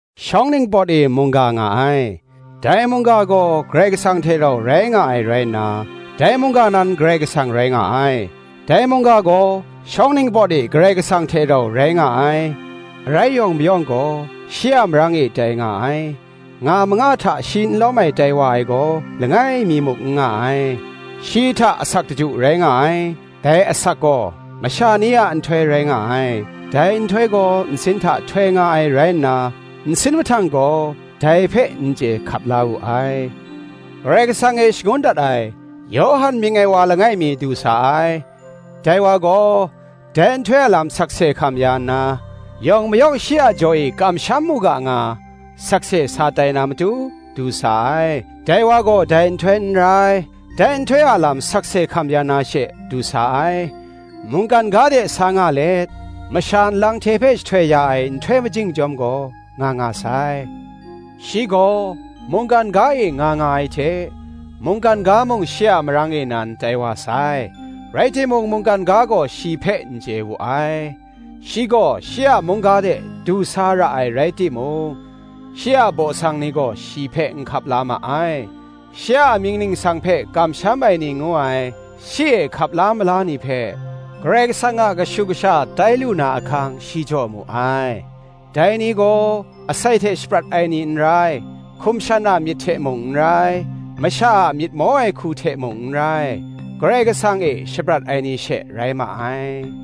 Shawng ningpawt e Mungga nga ai; dai Mungga gaw Karai Kasang hte rau rai nga ai rai nna, dai Mungga nan Karai Kasang rai nga ai. Dai Mungga gaw shawng ningpawt e Karai Kasang hte rau rai nga ai. Arai yawng mayawng gaw shi a marang e tai nga ai; nga manga hta shi n lawm ai tai wa ai gaw, langai mi muk n nga ai. Shi hta asak daju rai nga ai; dai asak gaw masha ni a nhtoi rai nga ai. Dai nhtoi gaw nsin hta htoi nga ai rai nna, nsin mahtang gaw dai hpe n chye hkap la wu ai. Karai Kasang e shangun dat ai, Yawhan mying ai wa langai mi, du sa ai: dai wa gaw, dai nhtoi a lam sakse hkam ya nna, yawng mayawng shi a jaw e kamsham mu ga nga, sakse sa tai na matu, du sa ai. Dai wa gaw dai nhtoi n rai; dai nhtoi a lam sakse hkam ya na she, du sa ai. Mungkan ga de sa nga let, masha nlang hte hpe jahtoi ya ai nhtoi majing chyawm gaw, nga nga sai. Shi gaw mungkan ga e nga nga ai hte, mungkan ga mung shi a marang e nan tai wa sai: rai timung mungkan ga gaw shi hpe n chye wu ai. Shi gaw shi a mung ga de du sa ra ai rai timung, shi a baw sang ni gaw shi hpe n hkap la ma ai. Shi a amying ningsang hpe kamsham ai ni ngu ai, shi e hkap la mala ni hpe, Karai Kasang a kashu kasha tai lu na ahkang shi jaw mu ai: dai ni gaw, asai hte shaprat ai ni n rai, hkum shan a myit hte mung n rai, masha a myit maw ai hku hte mung n rai, Karai Kasang e shaprat ai ni she rai ma ai.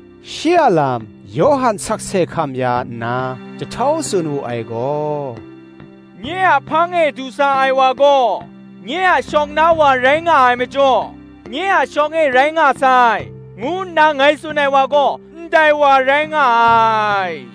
Shi a lam Yawhan sakse hkam ya nna jahtau tsun wu ai gaw, “Nye a hpang e du sa ai wa gaw, nye a shawng na wa rai nga ai majaw, nye a shawng e rai nga sai, ngu nna ngai tsun ai wa gaw, ndai wa rai nga ai,”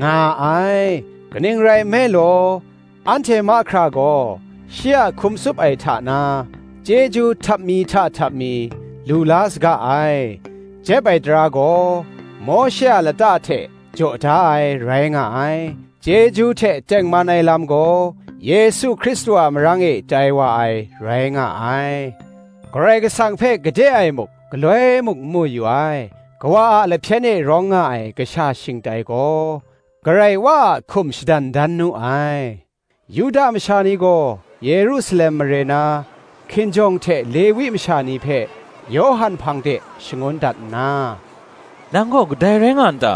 nga ai. Kaning rai nme law, anhte mahkra gaw, shi a hkum tsup ai hta na, chyeju htap mi hta htap mi, lu la saga ai. Jep ai tara gaw Mawshe a lata hte jaw da ai, rai nga ai; chyeju hte tengman ai lam gaw, Yesu Hkristu a marang e tai wa ai, rai nga ai. Karai Kasang hpe gade e muk galoi mung n mu yu ai; Kawa a lahpyen e rawng nga ai Kasha shingtai gaw, Karai Wa a hkum shadan dan nu ai. Yuda masha ni gaw Yerusalem mare na, hkinjawng hte Lewi masha ni hpe Yawhan hpang de shangun dat nna, “Nang gaw kadai rai nga n ta?”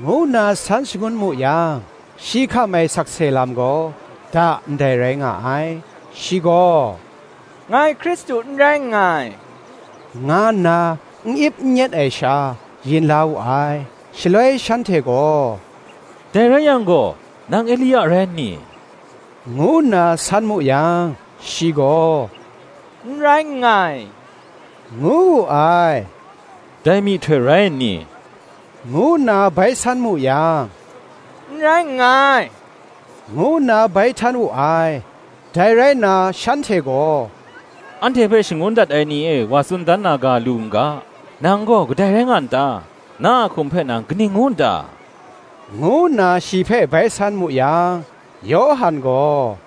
ngu nna san shangun mu yang, shi hkam ai sakse lam gaw, da ndai rai nga ai: shi gaw, “Ngai Hkristu n rai nngai,” nga nna n ip n nyet ai sha, yin la wu ai. Shaloi shanhte gaw, “Dai rai yang gaw, nang Elia rai nni?” ngu nna san mu yang, shi gaw, “N rai nngai,” ngu wu ai: “Dai myihtoi rai nni?” ngu nna bai san mu yang, “N rai nngai,” ngu nna bai htan wu ai. Dai rai nna shanhte gaw, “Anhte hpe shangun dat ai ni e wa tsun dan na ga lu n ga, Nang gaw kadai rai nga n ta? Na a hkum hpe nang kaning ngu n ta?” ngu nna shi hpe bai san mu yang, Yawhan gaw,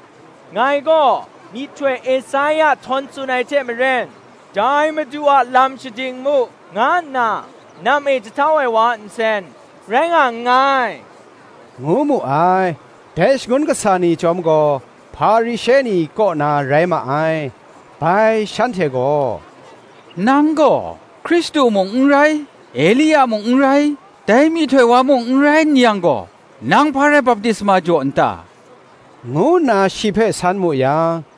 “Ngai gaw, myihtoi Esaia htawn tsun ai hte maren, ‘Dai Madu a lam shading mu,’ nga nna nam e jahtau ai wa a nsen rai nga nngai,” ngu mu ai. Dai shangun kasa ni chyawm gaw, Hparishe ni kaw na rai ma ai. Bai shanhte gaw, “Nang gaw, Hkristu mung n rai, Elia mung n rai, dai myihtoi wa mung n rai n yang gaw, nang hpa rai baptisma jaw n ta?” ngu nna shi hpe san mu yang,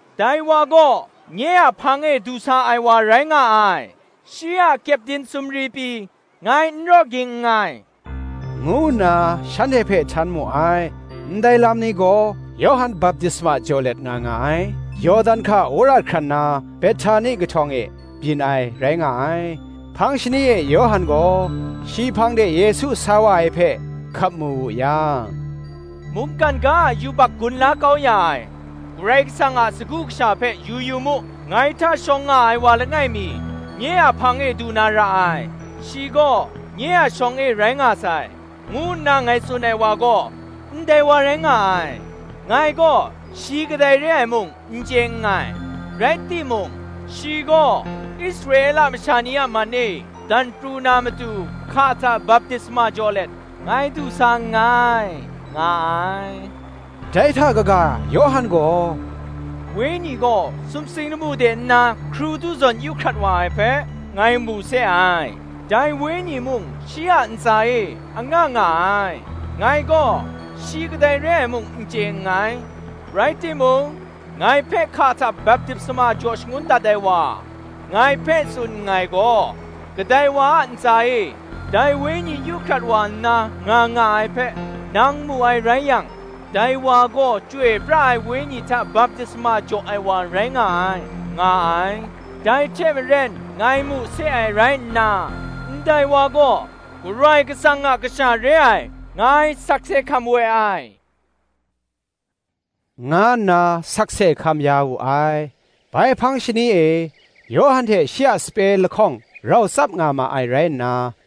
dai wa gaw nye a hpang e du sa ai wa rai nga ai; shi a kyepdin sumri pyi ngai n raw ging nngai,” ngu nna shanhte hpe htan mu ai. Ndai lam ni gaw, Yawhan baptisma jaw let nga nga ai, Yawdan hka wora hkran na Behtani kahtawng e byin ai, rai nga ai. Hpang shani e Yawhan gaw, shi hpang de Yesu sa wa ai hpe, hkap mu wu yang, “Mungkan ga a yubak gun la kau ya ai, Karai Kasang a Sagu Kasha hpe yu yu mu! ‘Ngai hta shawng nga ai wa langai mi, nye a hpang e du na ra ai; shi gaw nye a shawng e rai nga sai, ngu nna ngai tsun ai wa gaw, ndai wa rai nga ai.' Ngai gaw, shi kadai re ai mung n chye nngai; rai timung, shi gaw Israela masha ni a man e dan pru na matu, hka hta baptisma jaw let, ngai du sa nngai,” nga ai. Dai hta kaga Yawhan gaw, “Wenyi gaw sumsing lamu de nna hkrudu zawn yu hkrat wa ai hpe, ngai mu se ai: dai wenyi mung shi a ntsa e nga nga ai. Ngai gaw, shi kadai re ai mung n chye nngai: rai timung, ngai hpe hka hta baptisma jaw shangun dat ai wa, ngai hpe tsun nngai gaw, Kadai wa a ntsa e, dai Wenyi yu hkrat wa nna nga nga ai hpe, nang mu ai rai yang, dai wa gaw Chyoi pra ai Wenyi hta baptisma jaw ai wa rai nga ai,” nga ai. Dai hte maren ngai mu se ai rai nna, ‘ndai wa gaw Karai Kasang a Kasha re ai, ngai sakse hkam we ai,’ nga nna sakse hkam ya wu ai. Bai hpang shani e, Yawhan hte shi a sape lahkawng rau tsap nga ma ai rai nna,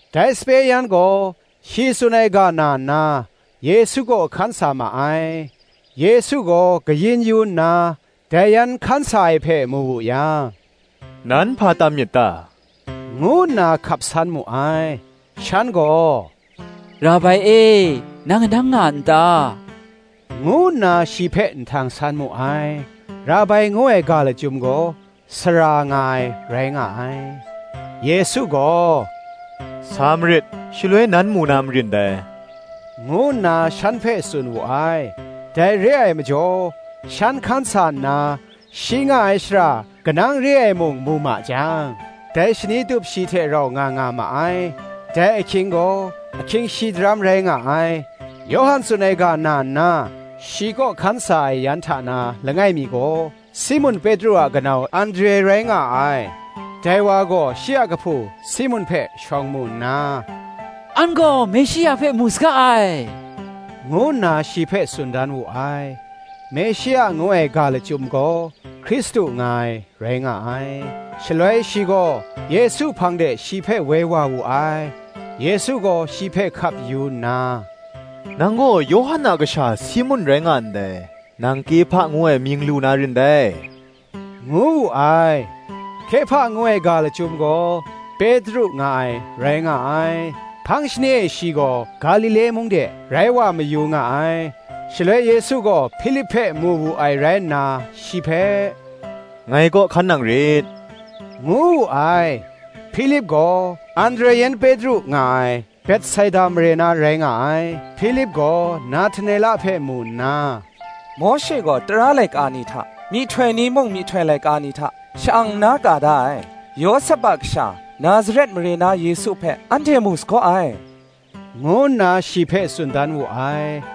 Dai sape yan gaw shi tsun ai ga na nna, Yesu kaw hkan sa ma ai. Yesu gaw kayin yu nna, dai yan hkan sa ai hpe mu wu yang, “Nan hpa tam myit ta?” ngu nna hkap san mu ai. Shan gaw, “Rabai e, nang kanang nga n ta?” ngu nna shi hpe nhtang san mu ai: (Rabai ngu ai ga lachyum gaw, Sara nga ai, rai nga ai.) Yesu gaw, “Sa marit, shaloi nan mu na marin dai,” ngu nna shan hpe tsun wu ai. Dai re ai majaw, shan hkan sa nna, shi nga ai shara kanang re ai mung mu ma jang, dai shani tup shi hte rau nga nga ma ai: dai ahkying gaw ahkying shi daram rai nga ai. Yawhan tsun ai ga na nna, shi kaw hkan sa ai yan hta na langai mi gaw, Simun Petru a kanau Andre rai nga ai. Dai wa gaw shi a kahpu Simun hpe shawng mu nna, “An gaw Meshia hpe mu saga ai,” ngu nna shi hpe tsun dan wu ai: (Meshia ngu ai ga lachyum gaw, Hkristu nga ai, rai nga ai.) Shaloi shi gaw Yesu hpang de shi hpe woi wa wu ai. Yesu gaw shi hpe hkap yu nna, “Nang gaw Yawhan a kasha Simun rai nga ndai: nang Kehpa ngu ai mying lu na rin dai,” ngu wu ai: (Kehpa ngu ai ga lachyum gaw, Petru nga ai, rai nga ai.) Hpang shani e shi gaw Galile mung de rai wa mayu nga ai. Shaloi Yesu gaw Hpilip hpe mu wu ai rai nna, shi hpe, “Ngai kaw hkan nang rit,” ngu wu ai. Hpilip gaw Andre yan Petru nga ai Betsaida mare na rai nga ai. Hpilip gaw Nahtanela hpe mu nna, “Mawshe gaw tara laika ni hta, myihtoi ni mung myihtoi laika ni hta, sha-ang nna ka da ai, Yawsep a kasha, Nazaret mare na Yesu hpe anhte mu sagaw ai,” ngu nna shi hpe tsun dan wu ai.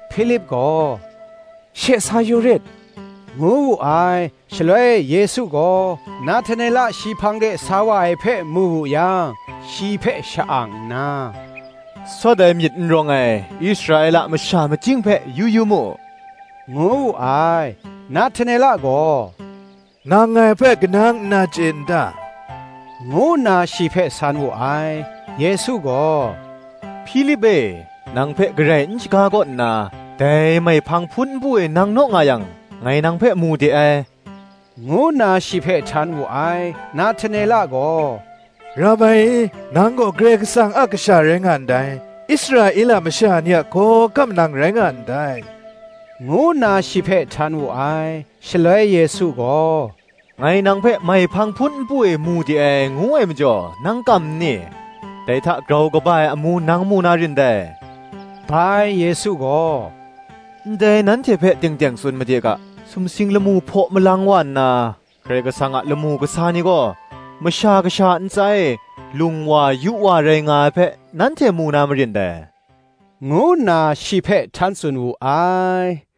Hpilip gaw, “She, sa yu rit,” ngu wu ai. Shaloi Yesu gaw, Nahtanela shi hpang de sa wa ai hpe mu wu yang, shi hpe sha-ang nna, “Sawt ai myit n rawng ai, Israela masha majing hpe yu yu mu,” ngu wu ai. Nahtanela gaw, “Nang ngai hpe kanang nna chye n ta?” ngu nna shi hpe san wu ai. Yesu gaw, “Hpilip e nang hpe garai n shaga kaw nna, dai maihpang hpun npu e nang naw nga yang, ngai nang hpe mu de ai,” ngu nna shi hpe htan wu ai. Nahtanela gaw, “Rabai e, nang gaw Karai Kasang a Kasha rai nga ndai; Israela masha ni a hkawhkam nang rai nga ndai,” ngu nna shi hpe htan wu ai. Shaloi Yesu gaw, “Ngai nang hpe maihpang hpun npu e mu de ai, ngu ai majaw, nang kam nni? dai hta grau kaba ai amu nang mu na rin dai.” Bai Yesu gaw, “Ngai nanhte hpe teng teng tsun made ga, Sumsing lamu hpaw malang wa nna, Karai Kasang a lamu kasa ni gaw, Masha Kasha a ntsa e lung wa yu wa rai nga ai hpe, nanhte mu na marin dai,” ngu nna shi hpe htan tsun wu ai.